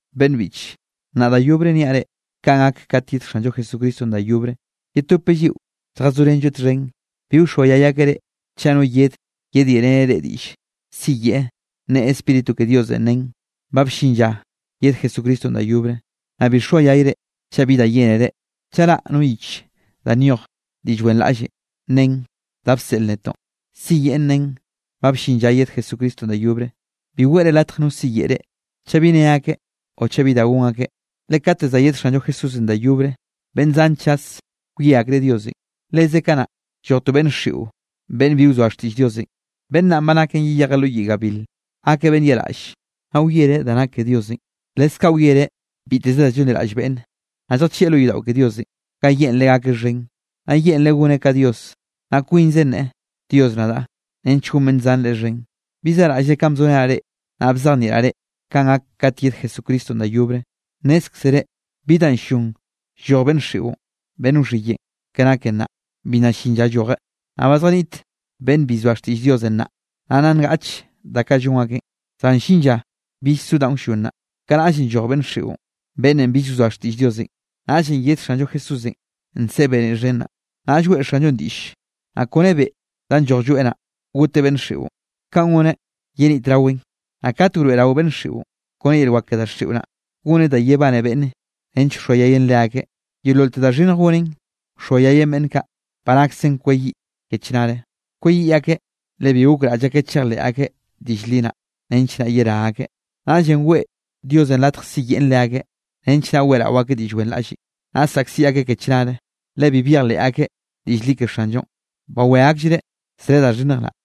Beꞌnn biꞌche, nnaꞌ da yobre niaꞌ reꞌ kanꞌ gak katenꞌ yed Xanllo Jesucristonꞌ da yobre, yetopeꞌ lliꞌo lljazorenlloeꞌ txhen. Bi wxoayay akeꞌ reꞌ, chaꞌ no yedeꞌ yedyeꞌreneꞌ reꞌ diꞌlle, siyeꞌe neꞌe Spíritu ke Diosenꞌ nen, ba bllin lla yed Jesucristonꞌ da yobre. Naꞌ bi xoayayre chaꞌ bi da yénere, chaꞌ raꞌ no yich da nyoj diꞌll wenraꞌlle nen da bseꞌl netoꞌn, siyeꞌn nen ba bllin lla yed Jesucristonꞌ da yobre. Bi weꞌre latj no siyeꞌe reꞌ, chaꞌ bi nne akeꞌ o chaꞌ bi da gon akeꞌ. Le kate za yed Xanllo Jesúsenꞌ da yobre, beꞌnn zan chas wie akreꞌ Diosenꞌ. Leze kanaꞌ lloj to beꞌnn xiꞌo, beꞌnn bi wzoa xtiꞌll Diosenꞌ. Beꞌnn naꞌn ba naken yeyejeꞌ lo yiꞌ gabil. Gakeꞌ beꞌnn yaꞌraꞌlle, naꞌ wiereꞌ da nak ke Diosenꞌ, leskaꞌ wiereꞌ biteze da llonliraꞌll beꞌnne. Naꞌ lljachieꞌ lo yodaꞌo ke Diosenꞌ ga yeꞌnreꞌ gakeꞌ xhen, naꞌ yeꞌnreꞌ goneꞌ ka Dios, naꞌ kwinze nneꞌe: “Dios nadaꞌ”, nench gon beꞌnn zan leꞌe xhen. ¿Bi zaꞌraꞌllre kanꞌ bzorenaꞌ reꞌ, naꞌ bzejnieꞌraꞌ reꞌ kanꞌ gak kat yed Jesucristonꞌ da yobre? Nnézkzere bi danꞌ ll-llon lloj beꞌnn xiꞌon beꞌnn wxhiyeꞌn, ke nake nnaꞌ, bi nna llin lla llojeꞌ. Naꞌ ba zjaniꞌt beꞌnn bi llzoa xtiꞌll Diosenꞌ nnaꞌ, naꞌ nna ngaꞌch da kaꞌ llon akeꞌn. Zan llin lla bill so danꞌ wllon naꞌ. Kanaꞌllenꞌ lloj beꞌnn xiꞌon, beꞌnnenꞌ bill wzoa xtiꞌll Diosenꞌ. Naꞌllenꞌ yed Xanllo Jesúsenꞌ nseꞌe beniꞌ xhen naꞌ, naꞌll weꞌe Xanllonꞌ diꞌll, naꞌ kone be danꞌ lloj lloeꞌ naꞌ, goteꞌ beꞌnn xiꞌon. Kaꞌn goneꞌ yenitraweꞌn. Naꞌ kat wroeꞌrao beꞌnn xiꞌon, kone yel wak ke daxiꞌo naꞌ, goneꞌ da yebane beꞌnne nench wxoayayeꞌn leakeꞌ. Yeololte da xhinnj goneꞌn, wxoayayeꞌn beꞌnn kaꞌ ba naksen kweyiꞌ ke chnare. Kweyiꞌ akeꞌ, le bi gokraꞌll akeꞌ chejleꞌ akeꞌ diꞌll li naꞌ, nench naꞌ yerá akeꞌ. Naꞌllenꞌ weꞌe Diosenꞌ latj siyeꞌn leakeꞌ, nench naꞌ weꞌrao akeꞌ diꞌll wenraꞌlle. Naꞌ saꞌkziꞌ akeꞌ ke chnare, le bi byejleꞌ akeꞌ diꞌll li ke Xanllonꞌ, bawé akllreꞌ zre da xhinnj naꞌ.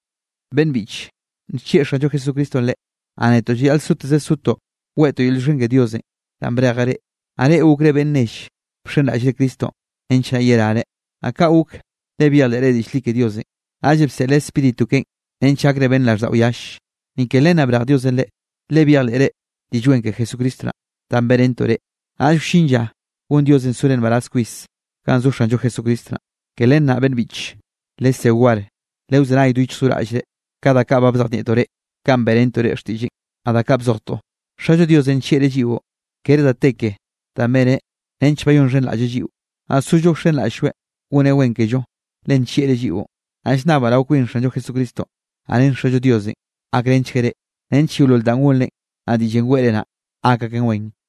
Beꞌnn biꞌche, nllieꞌ Xanllo Jesucristonꞌ reꞌ. Naꞌ netoꞌ llayaꞌl soteze sotoꞌ weꞌtoꞌ yel llioxken ke Diosenꞌ danꞌ brejeꞌ reꞌ, naꞌ reꞌ gokre beꞌnn nell bxenraꞌllre Cristonꞌ nench naꞌ yerare. Naꞌ kaꞌ gok, le byejleꞌre diꞌll li ke Diosenꞌ, naꞌllenꞌ bseꞌleꞌ Spíritu keꞌen nench gakre beꞌnn raꞌlldaꞌo yalle. Ni ke len naꞌ brej Diosenꞌ reꞌ, le byejleꞌre Diꞌll Wen ke Jesucristo naꞌ, danꞌ beꞌrentoꞌ reꞌ, naꞌll wllin lla gon Diosenꞌ sore nbaraz kwis ganꞌ zo Xanllo Jesucristo naꞌ. Ke len naꞌ, beꞌnn biꞌche, lesé war, lewzenay do yichj do raꞌllre ka da kaꞌ bzejnieꞌtoꞌ reꞌ, kanꞌ beꞌrentoꞌ reꞌ xtiꞌlleꞌn, naꞌ da kaꞌ bzojtoꞌ. Xallo Diosenꞌ nllieꞌreꞌ lliꞌo. Kere da te ke danꞌ beneꞌ nench bayonxhenraꞌlleꞌ lliꞌo, naꞌ sollo wxenraꞌll-lloeꞌ goneꞌ wen kello, le nllieꞌreꞌ lliꞌon. Naꞌ llnnabaꞌ rao kwin Xanllo Jesucristo, naꞌ ren Xallo Diosenꞌ, gakrenchgueꞌ reꞌ nench yeolol danꞌ gonrenꞌ, naꞌ diꞌllenꞌ weꞌre naꞌ, gak aken wen.